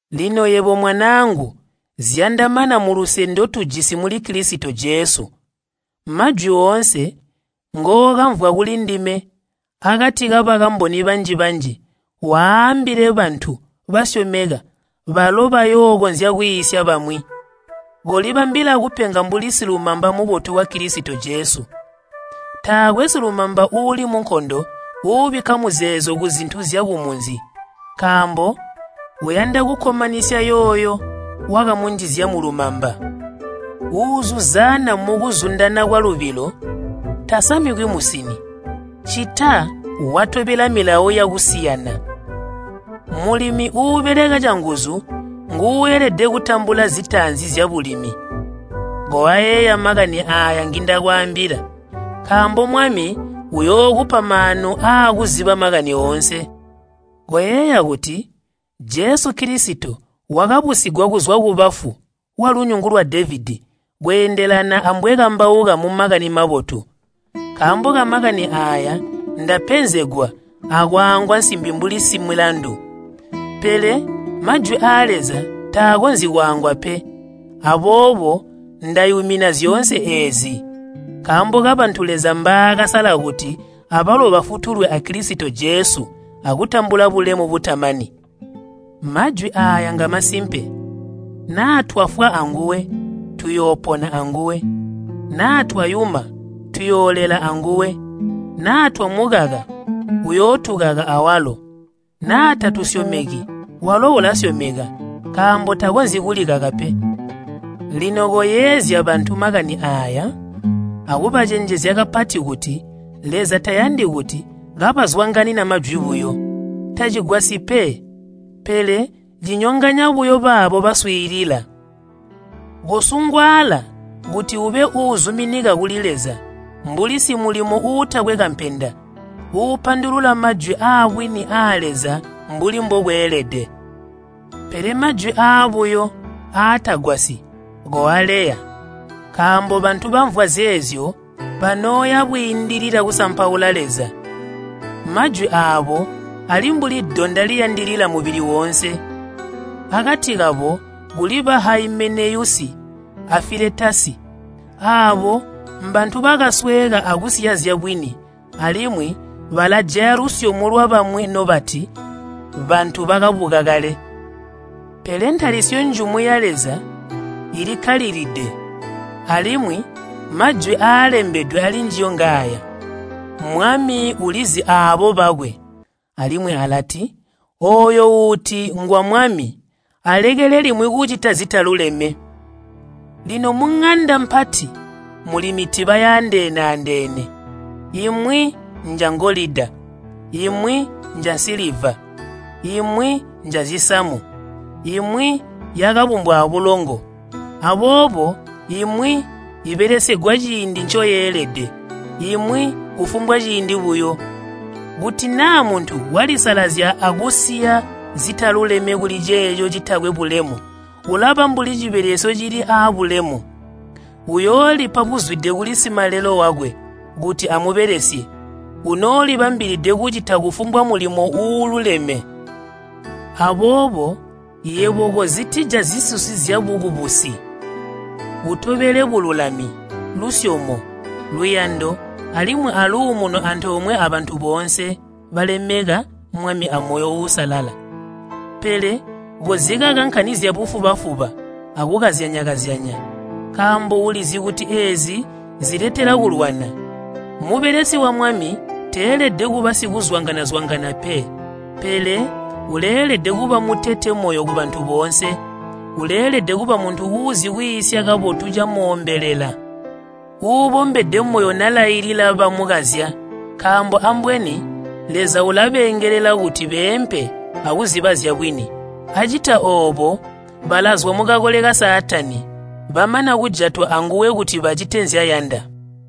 Lino yebo, mwanaangu, zyandamana muluse ndotujisi muli Kilisito Jesu. Majwi oonse ngookamvwa kulindime akati kabakamboni banji-banji, waambile bantu basyomeka balo bayookonzya kwiisya bamwi. Kolibambila kupenga mbuli silumamba mubotu wa Kilisito Jesu. Taakwe silumamba uuli munkondo uubikka muzeezo kuzintu zyakumunzi, nkaambo uyanda kukkomanisya yooyo wakamunjizya mulumamba. Uuzuzaana mukuzundana kwalubilo tasamikwi musini, ccita watobela milawo yakusiyana. Mulimi uubeleka canguzu nguuelede kutambula zitaanzi zyabulimi. Koayeeya makani aaya ngindakwaambila nkaambo Mwami uyookupa maanu aakuziba makani oonse. Koyeeya kuti, Jesu Kilisito wakabusigwa kuzwa kubafu walunyungu lwa Devedi, kweendelana ambwekambauka mu Makani Mabotu. Nkaambo ka Makani aaya ndapenzegwa akwaangwa nsimbi mbuli similandu. Pele Majwi aa Leza taakonzyi kwaangwa pe. Aboobo ndayumina zyoonse eezi nkaambo kabantu Leza mbaakasala kuti abalo bafutulwe a Kilisito Jesu akutambula bulemu butamani. Majwi aaya ngamasimpe, “Naa twafwa anguwe, tuyoopona anguwe. Naa twayuma, tuyoolela anguwe. Naa twamukaka, uyootukaka awalo. Naa tatusyomeki, walo ulasyomeka, nkaambo takonzyi kulikaka pe.” Lino koyeezya bantu makani aaya, akubacenjezya kapati kuti Leza tayandi kuti kabazwanganina majwi buyo. Tacigwasyi pe, pele cinyonganya buyo baabo baswiilila. Kosungwaala kuti ube uuzuminika kuli Leza mbuli simulimo uutakwe kampenda, uupandulula majwi aabwini aa Leza mbuli mbokweelede. Pele majwi aabuyo aatagwasyi koaleya, nkaambo bantu bamvwa zeezyo banooya bwiindilila kusampaula Leza. Majwi aabo ali mbuli donda liyandilila mubili woonse. Akati kabo kuli Haimeneyusi a Filetasi, aabo mbantu bakasweeka akusiya zyabwini alimwi balajaya lusyomo lwabamwi nobati, “Bantu bakabuka kale.” Pele ntalisyo njumu ya Leza ilikkalilide alimwi majwi aalembedwe alinjiyo ngaaya, “Mwami ulizi aabo bakwe,” alimwi alati, “Ooyo uuti ngwa Mwami alekele limwi kucita zitaluleme.” Lino muŋanda mpati muli mitiba yaandeene-andeene, imwi njangolida, imwi njansiliva, imwi njazisamu, imwi yakabumbwa abulongo. Aboobo imwi ibelesegwa ciindi ncoyeelede, imwi kufumbwa ciindi buyo. Kuti naa muntu walisalazya akusiya zitaluleme kuli ceeco citakwe bulemu ulaba mbuli cibelesyo cili aabulemu. Uyoolipa buzwide kuli Simalelo wakwe kuti amubelesye, unoolibambilide kucita kufumbwa mulimo uululeme. Aboobo yebo kozitija zisusi zyabukubusi. Utobele bululami, lusyomo, luyando alimwi aluumuno antoomwe abantu boonse balemeka Mwami amoyo uusalala. Pele kozikaka nkani zyabufuba-fuba akukazyanya-kazyanya, nkaambo ulizi kuti eezi ziletela kulwana. Mubelesi wa Mwami teelede kuba sikazwanga-zwanga pe, pele uleelede kuba mutete moyo kubantu boonse. Uleelede kuba muntu uuzi kwiisya kabotu camoombelela, uubombede moyo nalailila bamukazya. Nkaambo ambweni Leza ulabeengelela kuti beempe akuziba zyabwini. Acita oobo balazwa mukakole ka Saatani, bamana kujatwa anguwe kuti bacite nzyayanda.